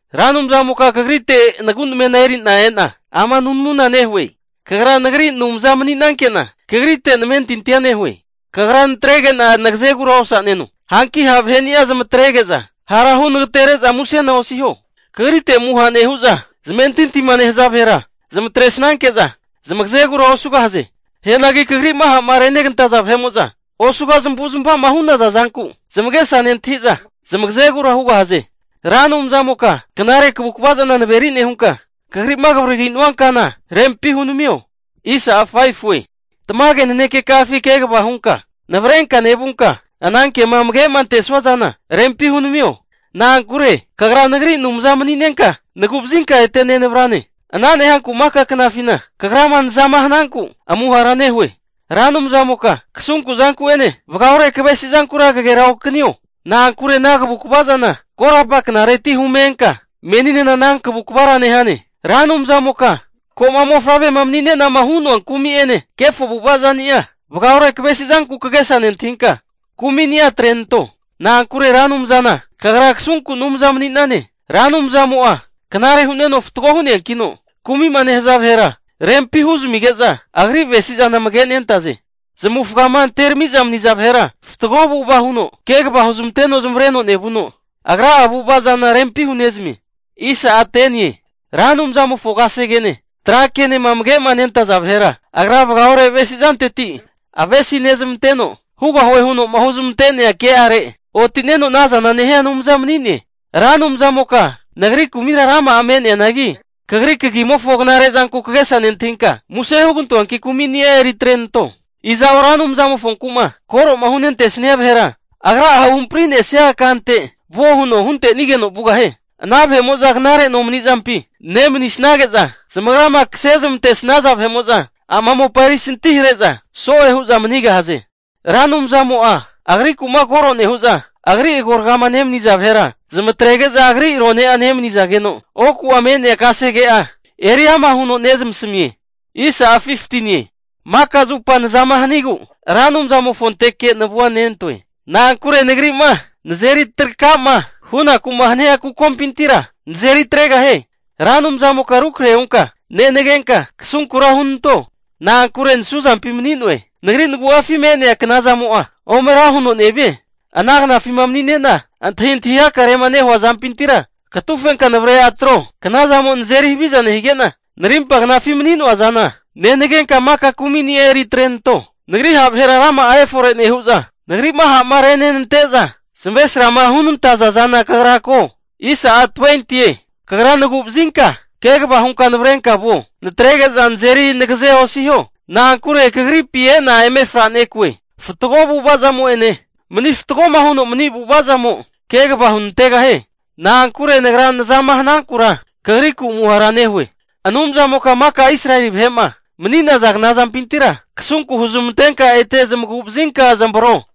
Ra Anumzamoka kagrite nagu namena eri'na e'na ama nunamuna nehue. Kagra nagri Anumza mani'nanke'na, kagrite namentintia nehue. Kagra natrege'na nagazegura osaneno. Hanki ha' vaheni'a zamatrege'za, hara hu nagate'nere'za musena osiho. Kagrite'ma amuha nehu'za zamentintima nehaza vahera zmatresnanke'za, zamagazegura osugahaze. Hianagi kagri'ma ha'ma renegantaza vahe'mo'za, osuga zamavu zamava'ma hu'naza zanku zamagesa nentahi'za zamagazegura hugahaze. Ra Anumzamoka knare kavukva zana naveri nehunka, Kagri'ma kavaririnua kana rempi hunamio. Tamage nanekeka'afi kegava hunka navrenka nevunka, anankema amage'ma antesnua zana rempi hunamio. Na'ankure kagra nagri Anumza mani'nenka, nagu'vazinka ete nenavrane. Ana nehanku maka knafina Kagrama nazama hananku, amuhara nehue. Ra Anumzamoka kasunku zanku'ene vagaore kavesi zankura kageraokanio. Na'ankure ana kavukva zana korapa knareti hume enka, meninena ana kavukvara nehane. Ra Anumzamoka, ko'ma mofavrema mani'nenama hu'noa kumi'ene kefo avu'ava zani'a, vagaore kavesizanku kagesa nentahinka kumini'a atrenanto. Na'ankure Ra Anumzana Kagra kasunku Anumza mani'nane. Ra Anumzamo'a knare hu'neno fatgo hu'neankino, kumi'ma nehaza vahera rempi huzamige'za, agri avesi'zana amage nentaze. Zamavufgama anteramiza maniza vahera, fatgo avu'ava huno kegava huzmanteno zamavareno nevuno, Agra'a avu'ava zana rempi hunezamie. Ra Anumzamofo kasegene trakenema amage'ma nentaza vahera, agra vagaore avesi zanteti zamavesi nezamanteno, hugahue huno'ma huzmante'nea ke'are oti'neno anaza nehia Anumza mani'ne. Ra Anumzamoka, nagri kumira rama'a me'neanagi kagri kagimofo knare zanku kagesa nentahinka, muse hugantoanki kumini'a eri atrenanto. Iza'o Ra Anumzamofonku'ma koro'ma hunte'nesnia vahera, Agra'a huhampri'nesia kante vuo huno huntenigeno vugahie. Ana vahe'mo'za knare nomani'zampi nemanisnage'za, zamagrama kase zamantesnaza vahe'mo'za ama mopa erisanti hare'za so'e hu'za manigahaze. Ra Anumzamo'a agriku'ma koro nehu'za, agri agoragama nemaniza vahera, zamatrege'za agri rone'a nemanizageno, oku'a me'nea kasege'a eri ama huno nezamasamie. Maka zupa nazama hanigu Ra Anumzamofonteke navua nentoe. Na'ankure nagri'ma nazeri traka'ma hunaku'ma hania kukompintira nazeri atregahie. Ra Anumzamoka rukrahe hunka nenagenka, kasunkura hunanto. Na'ankure nasuzampi mani'noe. Nagri nagu'afima me'nea knazamo'a ome ra huno nevie. Ana knafima manine'na antahintahi hakarema nehua zampintira, katufenka navre atro. Knazamo nazeri havizama nehige'na, narimpa knafima mani'noa zana nenagenka, maka kumini'a eri atrenanto. Nagri ha' vahera rama'a efore nehu'za, nagri'ma ha'ma renenante'za zamavesrama hunantaza zana kagra ko. Kagra nagu'nevazinka kegava hunka navrenka vuo. Natrege'za nazeri nagaze osiho. Na'ankure Kagripi e'na eme franekue. Fatgo avu'avazamo'ene, mani fatgoma huno mani avu'azamo kegava hunantegahie. Na'ankure nagra nazama hanankura kagriku amuhara nehue. Anumzamoka maka Israeli vahe'ma mani'naza kna zampintira kasunku huzmantenka ete zamagu'vazinka zamavro.